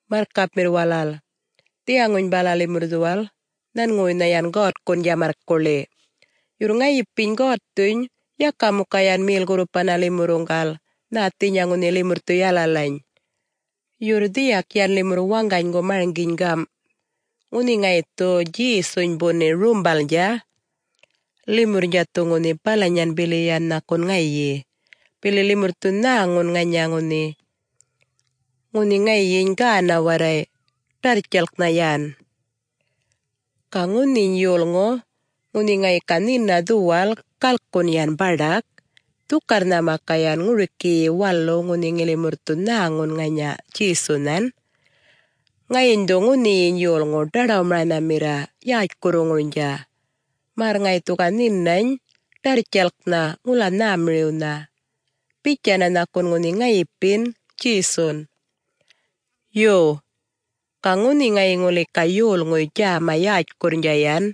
Marrkapmirr walal, dhiyaŋuny bala limurr dhuwal nhanŋuwuynha yan God-Waŋarrwun djamarrkuḻiny', yurr ŋayipiny God-Waŋarryuny yaka muka yan mel-gurrupana limurruŋgal nhäthinyan ŋunhi limurr dhu yalalaŋumirriy. Yurr dhiyak yan limurr dhuwal waŋganygu marŋginy gam', Ŋunhi ŋayi dhu Djesuny buni rumbalnydja, limurrnydja dhu ŋunhi balanyan bili yan nhakun ŋayin, bili limurr dhu ŋanya ŋunhi nhäŋun, ŋunhi ŋayiny gäna warray dhika, ḏarrtjalk yan. Ga ŋunhiny yolŋu ŋunhi ŋayi ga nhina dhiyal galkun yan baḏak, gatjpu'yun ŋayi ga ŋuriki bili yan waluwnydja ŋunhi limurr dhu nhäŋun ŋanya Djesuny, ŋayiny ŋathil dhu ŋunhiyiny yolŋu ḏaḏawmaranhamirr ŋanyapinya ŋayi yätjkurruŋurnydja, märr ŋayi dhu ga nhinany ḏarrtjalknha yan ŋula nhämiriwnha, bitjanna nhakun ŋunhi ŋayipin Djesun. Yo. Ga ŋunhi ŋayi ŋuli ga yolŋuy djäma yätjkurrnydja yan,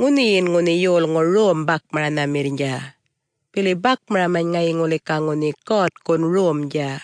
ŋunhiyin ŋunhi yolŋu rom-bakmaranhamirrnydja, bili bakmaramany ŋayi ŋuli ga ŋunhi God-Waŋarrwun romdja.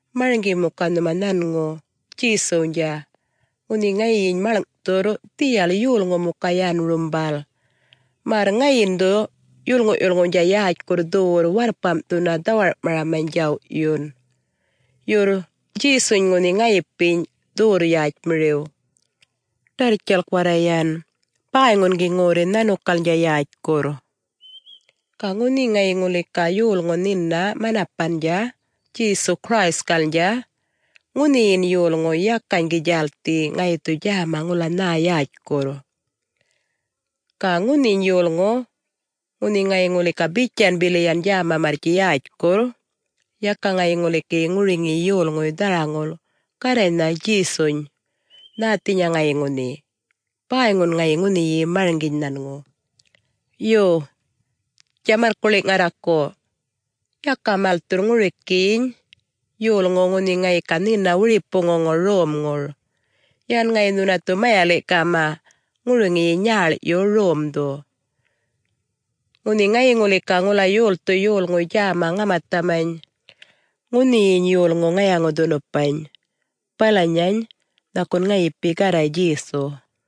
Marŋgi muka nhuma nhanŋu Djesuwnydja, ŋunhi ŋayiny maḻŋ'thurr dhiyal yolŋu muka yan rumbal, märr ŋayiny dhu limurruŋguny yolŋuwnydja walalaŋ yätjkurrnydja dhuwurr warrpam'thunna djaw'yundja dhawar'maraman yan. Yurr Djesuny ŋunhi ŋayipiny dhuwurr-yätjmiriw, ḏarrtjalk warray dhika, bäyŋun gi ŋorri nhanukalnydja ŋula nhä yätjkurr. Ga ŋunhi ŋayi ŋuli ga yolŋu nhina waŋgany-manapandja Djesu-Christkalnydja, ŋunhiyiny gi yolŋu bäyŋun djälthi ŋayi dhu ga djäma ŋula nhä yätjkurr wiyindja. Ga ŋunhiny yolŋu ŋunhi ŋayi ŋuli ga bitjan bili yan djäma yätjkurrnydja, yakan ŋayi ŋuli gi ŋuriŋiyiny yolŋuy nhäŋu dharaŋulnydja Garraynhany Djesunhany nhäthinya ŋayi ŋunhi; bäyŋun ŋayi ŋunhi marŋginy nhanŋu. Yo, djamarrkuḻi' ŋarraku, yaka malthurr ŋurikiny yolŋuw ŋunhi ŋayi ga nhina wiripuŋuŋur romŋur; ŋayi balaŋ bäynha nhuna mayali'-gäŋun ŋuriŋin ŋunhi nyäḻ'yun romdhu. Ŋunhi ŋayi ŋuli ga ŋula yolthu yolŋuy djäma ŋamathamany, ŋunhiyin yolŋu ŋayaŋu-dhunupany, balanyany nhakun ŋayipiny Garraynydja Djesuny.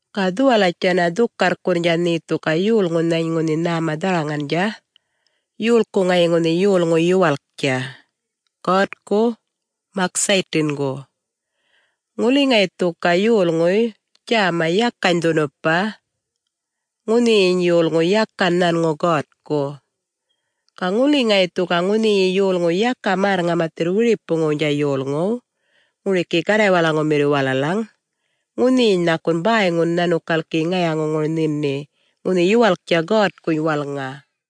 Ga dhuwalatjandhin dhukarrkurr nhe dhu ga ŋunhi yolŋunhany walalany nhäma dharaŋandja, yolku ŋayi ŋunhi yolŋu yuwalk, God-Waŋarrwu, mak nhanŋu ŋurikiyi buŋgawaw Mokuywu. Ŋuli ŋayi dhu ga ŋunhi yolŋuy djäma yakany ŋamatham, ŋunhiyiny ŋayi yolŋu balanyayiny yakan nhanŋuny God-Waŋarrwuny, ga ŋuli ŋayi dhu ga ŋunhiyi yolŋu yakany märr-ŋamathirr wiripuŋuwnydja yolŋuw walalaŋ, ŋunhiyiny nhakun bäyŋuyi yan nhanukal gi ŋayaŋuŋur nhini ŋunhi yuwalktja God-Waŋarrwuny walŋa.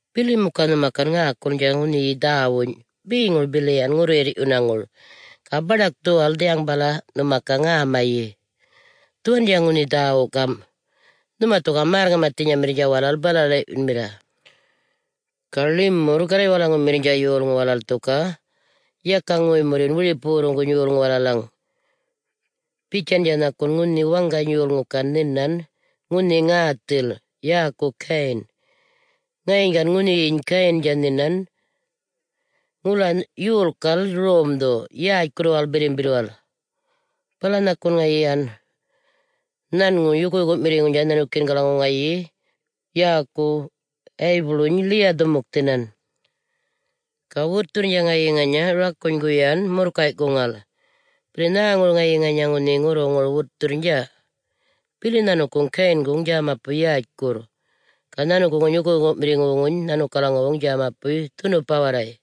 Bili muka nhuma gan ŋäkulnydja ŋunhiyi dhäwuny' beŋur bili yan ŋurruyirr'yunaŋur, ga baḏak dhuwal dhiyaŋ bala nhuma ga ŋämayi yan, dhuwandja ŋunhi dhäwu gam'. Limurr dhu ga märr-ŋamathinyamirrnydja bala-räli'yunmirra yan. Ga limurr Garraywalaŋumirrnydja yolŋu walal dhu ga yaka ŋoy-murryun wiripuwurruŋguny yolŋuw walalaŋ bitjandja nhakun ŋunhi waŋgany yolŋu gan nhinan ŋäthil, yäkuny ŋayi Gayin. Ŋayiny ŋunhiyiny Gayindja gan nhinan ŋula yolkal romdhu yätjkurruwal Birrimbirrwal, bala yan ŋayi yukuyuku'mirriŋuwnydja nhanukiyingalaŋaw ŋayi yäkuw Waybulwuny ḻiya-dhumukthinan, ga wutthurrnydja ŋayi ŋanya ŋunhi rakunygun yan murrkay'kuŋala. Bili nhäŋur ŋayi ŋanya ŋunhi ŋurruŋurnydja wutthurr? Bili ŋayiny ŋunhi Gayindja dhuwurr-yätj yolŋu, ga ŋayiny ŋunhi yukuyuku'mirriŋuny nhanŋu dhuwurr-dhunupa warray.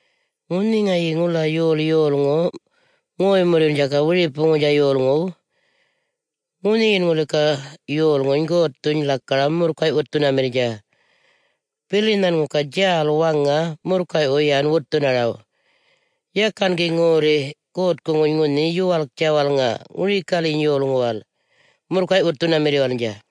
Ŋunhi ŋayi ga ŋula yol yolŋu ŋoy-murryundja wiripuŋuwnydja yolŋuw, ŋunhiyin ŋuli ga yolŋuny God-Waŋarryuny lakaram murrkay'-wutthunamirrnydja, bili nhanŋu ga djäl waŋa murrkay'wu yan bunharaw; yakan gi ŋula ŋorri God-Waŋarrwuŋuny ŋunhi yuwalktja walŋa ŋurikalyiny yolŋuwal murrkay'-wutthunamirriwalnydja.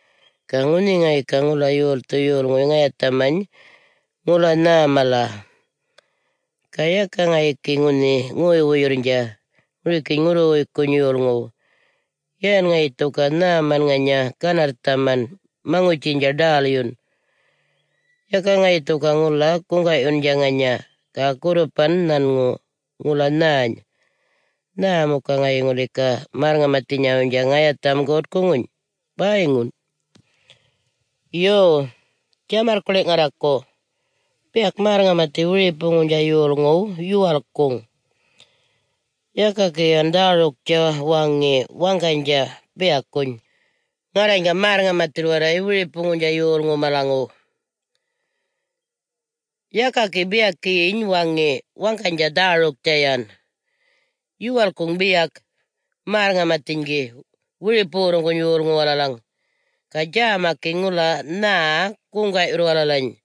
Ga ŋunhi ŋayi ga ŋula yolthu yolŋuy ŋayathamany ŋula nhäny mala, ga yaka ŋayi gi ŋunhi ŋoy-wuyurrnydja ŋurikiny ŋunhi ŋurruwuykkuny yolŋuw, yan ŋayi dhu ga nhäman ŋanya ganarrthaman maŋutjiynydja ḏälyun, ga yaka ŋayi dhu ga ŋula guŋga'yundja ŋanya ga gurrupan nhanŋu ŋunhi ŋula nhäny mala, nhä muka ŋayi ŋuli ga balanyarayyiny ŋunhi yolŋuy märr-ŋamathinyawuynydja ŋayatham God-Waŋarrwuŋuny? Bäyŋun! Yo, djamarrkuḻi' ŋarraku, biyak märr-ŋamathi gi wiripuŋuwnydja yolŋuw yuwalkkuŋ yan; yaka gi yan dhäruktja waŋi waŋganydja biyakuny, “Ŋarrany ga märr-ŋamathirr warray nhumalaŋguny yolŋuw walalaŋ.” Yaka gi biyakiyiny waŋi waŋganydja dhäruktja yan. Yuwalkkuŋ biyak märr-ŋamathiny gi wiripuwurruŋguny yolŋuw walalaŋ, ga djäma gi ŋula nhä guŋga'yurr muka walalany.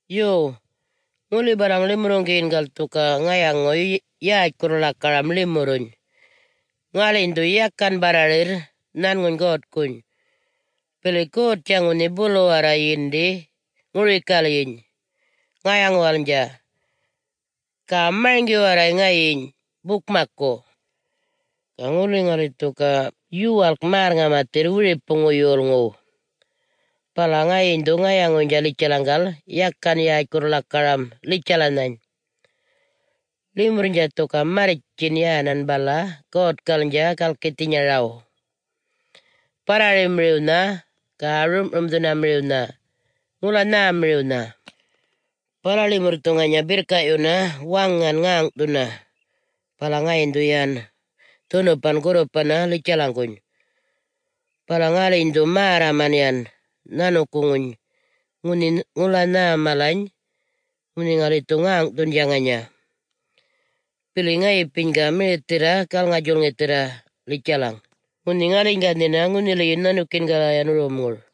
Yo. Ga ŋuli balaŋ limurruŋgiyingal dhu ga ŋayaŋuy yätjkurr-lakaramany limurruny, ŋaliny dhu yakan barrarirr nhanŋuny God-Waŋarrwuny, bili God-Waŋarrnydja ŋunhi bulu warray yindi ŋurikalyiny ŋayaŋuwalnydja, ga marŋgi warray ŋayiny bukmakku. Ga ŋuli ŋali dhu ga ŋunhi yuwalkkuman ŋula märr-ŋamathirr wiripuŋuwnha yolŋuw, bala ŋayiny dhu ŋunhi ŋayaŋuynydja litjalaŋgal yakan yätjkurr-lakaramany limurruny; limurrnydja dhu ga ŋunhi marrtjin yan balany God-Waŋarrwalnydja galkithinyaraw barrarimiriwnha ga rum'rumdhunamiriwnha ŋula nhämiriwnha, bala limurr dhu ŋunhi birrka'yunna ŋäŋ'thunna ŋanya God-Waŋarrnhany, bala ŋayiny dhu yan dhunupan gurrupanna litjalaŋguny. Bala ŋaliny dhu märraman yänan nhanukuŋuny ŋunhi ŋula nhä malany ŋamakurrnydja ŋunhi ŋali dhu ŋäŋ'thundja ŋanya, bili ŋayipiny ga mirithirra galŋa-djulŋithirr litjalaŋ, ŋunhi ŋaliny ga nhina ŋunhiliyin nhanukiyingala yan romŋur.